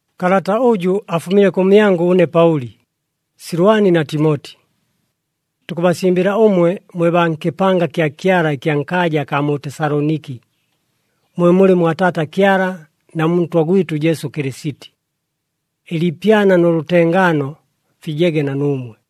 Kalata ʉjʉ afumile kʉmyangʉ ʉne Paʉli, Silwani na Timoti. Tukʉbasimbɨla ʉmwe mwe baa nkɨpanga kya Kyala ɨkya nkaaja akaa mu Tesaloniki, mwe mulɨ mwa Taata Kyala na mu Ntwa gwɨtʉ Jesu Kɨlɨsiti. Ɨliipyana nʉ lʉtengaano fijege na nuumwe.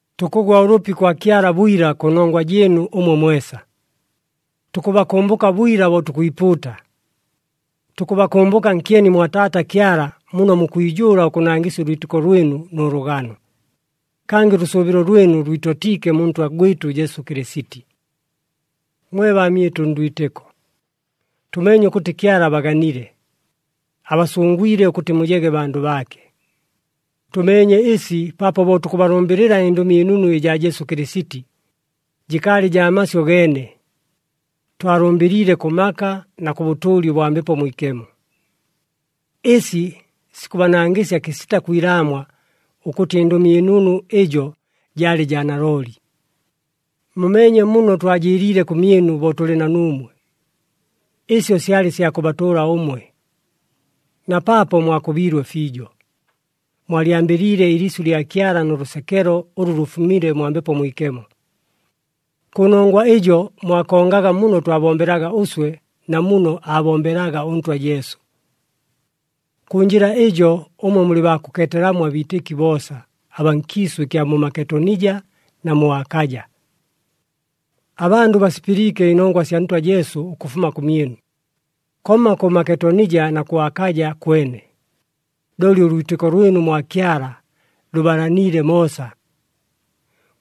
Tukʉgwa ʉlʉpi kwa Kyala bwila, kʉnongwa jɨɨnu ʉmwe mwesa. Tukʉbakʉmbʉka bwila bo tukwipuuta. Tukʉbakʉmbʉka nkyeni mwa Taata Kyala muno mukwijʉʉla ʉkʉnangɨsya ʉlwitɨko lwɨnu nʉ lʉgano, kangɨ ʉlʉsʉʉbɨlo lwɨnu lwitotiike mu Ntwa gwɨtʉ Jesu Kɨlɨsiti. Mwe baamyɨtʉ ndwitɨko, tʉmeenye ʉkʉtɨ Kyala abaganile, abasʉngwile ʉkʉtɨ mujege bandʉ baake. Tʉmeenye ɨsi paapo bo tukʉbalʉmbɨlɨla ɨNdʉmi ɨNunu ɨjaa Jesu Kɨlɨsiti, jɨkaalɨ jaa masyʉ geene, twalʉmbɨliile kʉ maka na kʉ bʉtʉʉli ʉbwa Mbepo Mwikemo. Ɨsi sikʉbanangɨsya kɨsita kwilaamwa ʉkʉtɨ ɨNdʉmi ɨNunu ɨjo jaalɨ jaa nalooli. Mumeenye muno twajɨɨliile kʉmyɨnu bo tʉlɨ na nuumwe. Ɨsyo syalɨ sya kʉbatʉʉla ʉmwe. Na paapo mwakʉbiilwe fiijo, mwalyambɨliile ɨliisyʉ lya Kyala nʉ lʉsekelo ʉlʉ lʉfumile mwa Mbepo Mwikemo. Kʉnongwa ɨjo mwakongaga muno twabombelaga ʉswe na muno aabombelaga ʉNtwa Jesu. Kʉ njɨla ɨjo ʉmwe mulɨ baa kʉkeetelamo abiitɨki boosa, abaa nkiisʉ ɨkya mu Maketonija na mu Akaja. Abandʉ basipɨliike ɨnongwa sya Ntwa Jesu ʉkʉfuma kʉmyɨnu, komma kʉ Maketonija na kʉ Akaja kwene, looli ʉlwitɨko lwɨnu mwa Kyala lʉbalaniile moosa.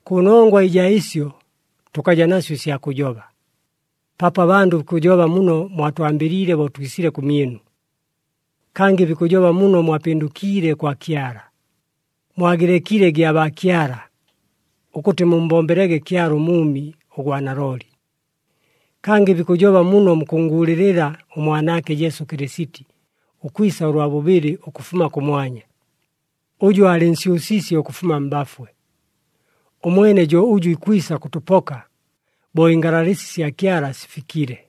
Kʉnongwa ɨjaa ɨsyo tʉkaja nasyo ɨsya kʉjoba, paapo abandʉ bikʉjoba muno mwatwambɨliile bo twisile kʉmyɨnu. Kangɨ bikʉjoba muno mwapɨndʉkiile kwa Kyala, mwagɨlekile gyabaakyala, ʉkʉtɨ mummbombelege Kyala ʉMʉʉmi, ʉgwa nalooli. Kangɨ bikʉjoba muno mukʉnnguulɨlɨla ʉMwanaake Jesu Kɨlɨsiti ʉkwisa ʉlwa bʉbɨlɨ ʉkʉfuma kʉmwanya, ʉjʉ aalɨnsyʉsiisye ʉkʉfuma mbafwe. Ʉmwene jo ʉjʉ ikwisa kʉtʉpoka bo ɨngalalɨsi sya Kyala sifikile.